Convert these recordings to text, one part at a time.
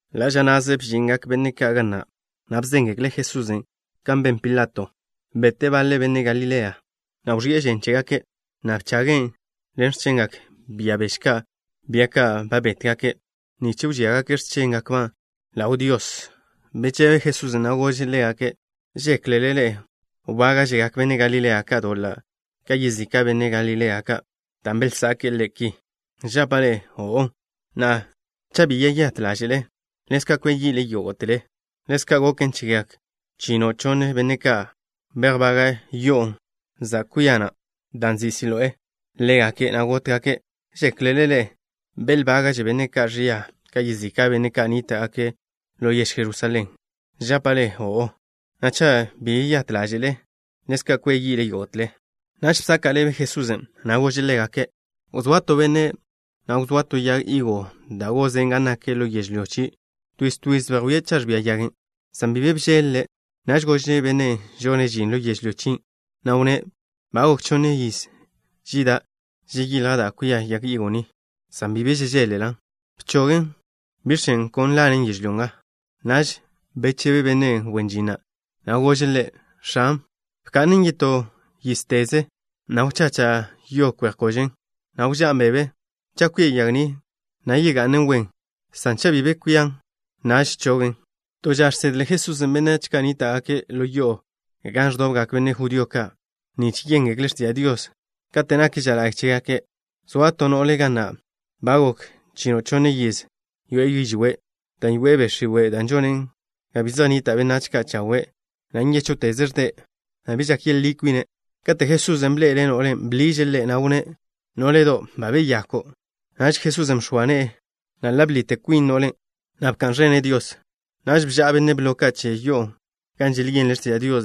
Ḻa' ža na'ze bžingak benne' ka' ga na', na' bzéngekle' Jesusen' kan ben Pilato. Bete' baḻe benne' Galilea, na' wẕi'e žen chégake', na' bchagen' ḻen x̱chengak bia beže, bia ka' ba bétgake'-ba' nich wžíagake' x̱chéngakba' ḻaw Dios. Bechebe Jesusen', na' gože' ḻégake': —¿Žéklele ḻe'e wbága'žegak benne' Galilea ka' doḻa' ka yezika' benne' Galilea ka', dan' belzake'e ki? Žapa' ḻe'e: O'o, na' cha' bi yeyát ḻáže'le, ḻezka' kwia yi'le yógo'tele. Ḻezka' goken chegak chino' chonne benne' ka', bejbaga' yo'o zan kwia na', da' nzin' Siloé, ḻégake', na' gótgake'. ¿Žéklele ḻe'e belbága'že benne' ka' ẕia ka yezika' benne' ka' nníta'gake' ḻo yež Jerusalén? Žapa' ḻe'e: O'o, na' cha' bi yeyát ḻáže'le, ḻezka' kwia yi'le yógo'tele. Naž bzaka' ḻebe Jesusen', na' gože' ḻégake': —Wzóa to benne', na' wzóa to yag higo da' gozen' gan nak ḻo yežlyó chie'. Twiz twiz bejwíe' cha' ẕbia yagen', san bi be bžeḻ-le'. Naž gože' benne' žone' žin ḻo yežlyó chien', na' wnné': “Ba gok chonniz žida' žeyilja' da' kwia yag higo ni, san bi be žežeḻ-lan'. Bchogen. ¿Biẕ chen' kon lanen yežlyó nga?” Naž bechebe benne' wen žin na', na' gože' ḻe': “X̱an, bka'nen yetó yízteze, na' wzacha' yo kwe'j kožen, na' wžá'n bebe. Cha' kwia yag ni, na' yega'nen wen, san cha' bi be kwian, naž chogon'.” To ža žsedle Jesusen' benách ka' nníta'gake' ḻo yo'o gan ẕdobgak benne' judío ka' nich yéngekle' x̱tiža' Dios kate' nak ža la'y chégake'. Zoa to no'le ga na' ba gok chino' chonne yiz yoe'e yižwé', dan' yoe'e be' x̱iwe' da' žonen ga bi zej nnita' benách ka' chawe', na' nyéchwteze' ẕde', na' bi žak yeḻí kwine'. Katen' Jesusen' bḻe'ele' no'len', bḻiže' ḻe', na' wnné': —Nó'ledo', ba beyako'. Naž Jesusen' bx̱oa ne'e ḻe', na' ḻa' bḻite kwin no'len', na' bka'n ẕene' Dios. Naž bža'a benne' blo che yo'o gan želyenle' x̱tiža' Dios.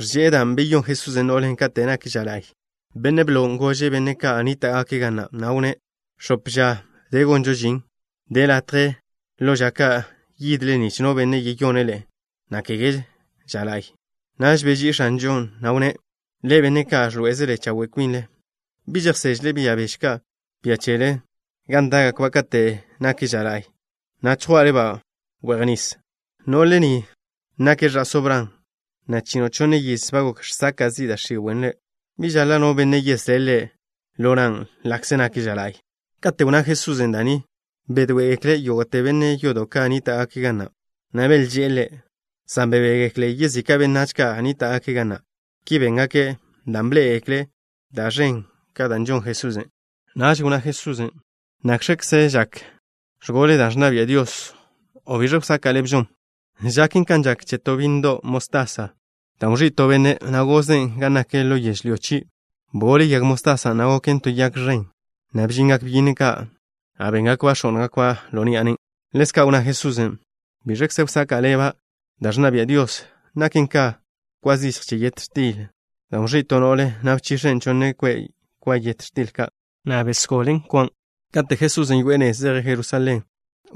Ẕže'e dan' beyón Jesusen' no'len' kate' nak ža la'y. Benne' blon' gože' benne' ka' nníta'gake' ga na', na' wnné': —X̱op ža de gonžo žin. De latje ḻo ža ka' yidle nich no benne' yeyone' ḻe'e, na' kege ža la'y. Naž beží'i X̱anžon', na' wnné': —Ḻe'e, benne' ka' ẕḻoé'ezele chawe' kwinle, ¿bi žejsežle bia beže ka' che chele gan dá'gakba' kate' nak ža la'y, na' chjwá'le-ba' we'j nis? No'le ni nake' ẕa'só Bran, na' chino' chonne yiz ba gok žsaka' zi' da' x̱iwe' ḻe'. ¿Bi žaḻa' no benne' yeslé' ḻe' lo nan' ḻa'kze nak ža la'y? Kate' wnná Jesusen' da' ni, bedoé'egekle yógo'te benne' yodo' ka' nníta'gake' ga na', na' belžé'e Ḻe', san bebégekle yezika' benách ka' nníta'gake' ga na'. Ki béngake' dan' bḻé'egekle' da' ẕen ka' da' žon Jesusen'. Naž wnná Jesusen': —¿Nakx̱kze žak ẕgole da' ẕnna bia' Dios, o biẕe wsaka' ḻebžon? Žaken kan žak che to bínnedo' mostasa, dan' wẕí' to benne', na' gozen' gan nak ḻo yežlyó chie'. Bgole yag mostasan', na' goken to yag ẕen, na' bžingak byínnedo' ka', na' béngakba' x̱ó'ngakba' ḻo ni'a nen'. Ḻezka' wnná Jesusen': —¿Biẕkze wsaka' ḻeba' da' ẕnna bia' Dios? Naken ka kwa zichj che yet x̱til, dan' wẕí' to no'le, na' bchix̱en' chonne kwe' kwa yet x̱til, na' bgole dot kwan'. Kate' Jesusen' yoe'e nez zeje' Jerusalén,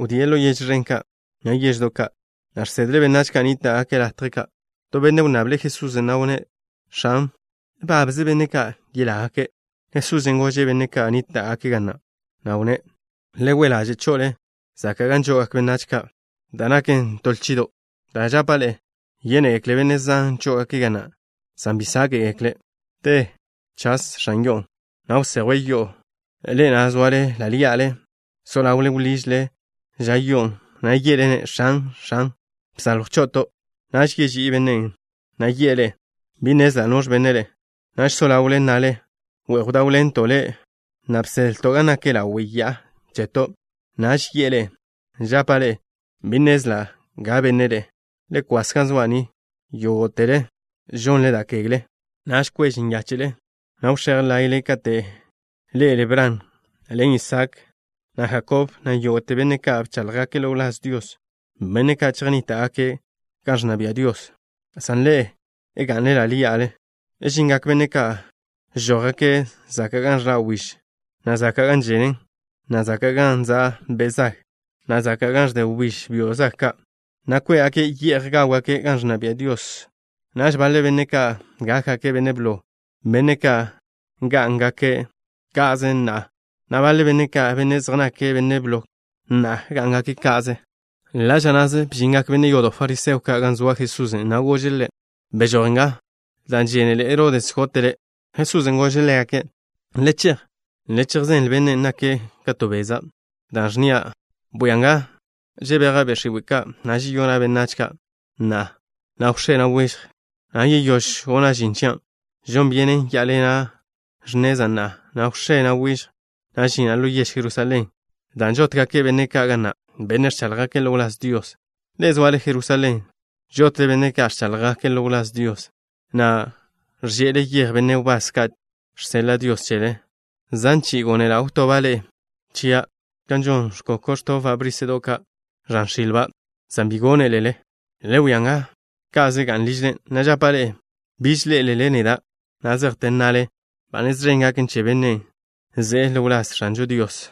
wdíe' ḻo yež ẕen ka', na' yeždo' ka', na' žsedle' benách ka' nníta'gake' latje ka'. To benne' wnnable' Jesusen', na' wnné': —X̱an, ¿babze benne' ka' yelágake'? Jesusen' gože' benne' ka' nníta'gake' ga na', na' wnné': —Le we' ḻaže' cho'ole zaka' gan žo'ogak benách ka', da' naken to lchido', dan' žapa' ḻe'e: yénegekle benne' zan chó'ogake' ga na', san bi sáke'gekle'. Te chas x̱an yo'o, na' wsejwe' yo'o, ḻe'e na' soale ḻa' ḻí'ale, so ḻawle wḻižle ža yo'on', na' ye'le-ne': “X̱an, x̱an, bsaljw cho'oto'.” Naž yeží'i bennen', na' yi'e ḻe'e: “Bi nnezla' noẕ benne' ḻe'e.” Naž so ḻawle nnale: “We'j bdáwḻento' Le', na' bsedlo' gan nak ḻawe' ya'a cheto'.” Naž yi'e ḻe'e: “Žapa' ḻe'e, bi nnezla' ga benne' ḻe'e. Le kwas ga zoa' ni, yógo'tele žonle da' kegle.” Naž kwež nyáche'le, na' wx̱éj láye'le kate' ḻé'elele Bran, ḻen Isaak, na' Jakob, na' yógo'te benne' ka' bcháḻjgake' ḻo wláz Dios, benne' ka' chejnníta'gake' gan ẕnna bia' Dios, san ḻe'e ga'nle ḻa' ḻí'ale. Žingak benne' ka' žójgake' zaka' gan ẕḻa' wbíž, na' zaka' gan ženen, na' zaka' gan za' be' zag, na' zaka' gan ẕde wbíž byo' zag ka', na' kwé'gake' ye'j gáwgake' gan ẕnna bia' Dios. Naž baḻe benne' ka' gákgake' benne' blo, benne' ka' ngá'ngake' ka'ze na'a, na' baḻe benne' ka', benne' zej nake' benne' blo na'a, gá'ngake' ka'ze. Ḻa' ža na'ze bžingak benne' yodo' fariseo ka' gan zoa Jesusen', na' góžgake' Ḻe': —¡Bežój! ¡Beẕónnj nga, dan' žénele Herodes gote' Le'! Jesusen' gože' ḻégake': —Le chej. Le chejzenle bennen' nake' ka to beza', da' ẕnnia': Bwia nga, žebeja' be' x̱iwe' ka', na' žeyona' benách ka' na'a, na' wx̱é, na' wižj, na' yeyóž gona' žin chia'. Žon byenen yá'aḻena' x̱neza' na'a, na' wx̱é, na' wižj, na' žina' ḻo yež Jerusalén, dan' žótgake' benne' ka' ga na', benne' ẕcháḻjgake' ḻo wláz Dios. ’Ḻe'e, zoale Jerusalén. Žotle benne' ka' ẕcháḻjgake' ḻo wláz Dios, na' ẕže'ele yej benne' wbás ka' žseḻa' Dios chele. Zan chi'i gónela' wtoba' ḻe'e chia' kan žon ẕkoko', ẕtobba' bríse'do' ka' ẕan x̱ilba', san bi gónelele. Le wia nga, ka'ze ga'n ližle, na' žapa' ḻe'e, biž ḻé'elele neda' na' zejte nnale: “Ba nez ẕen gaken che bennen' ze'e ḻo wláz X̱anžo Dios.”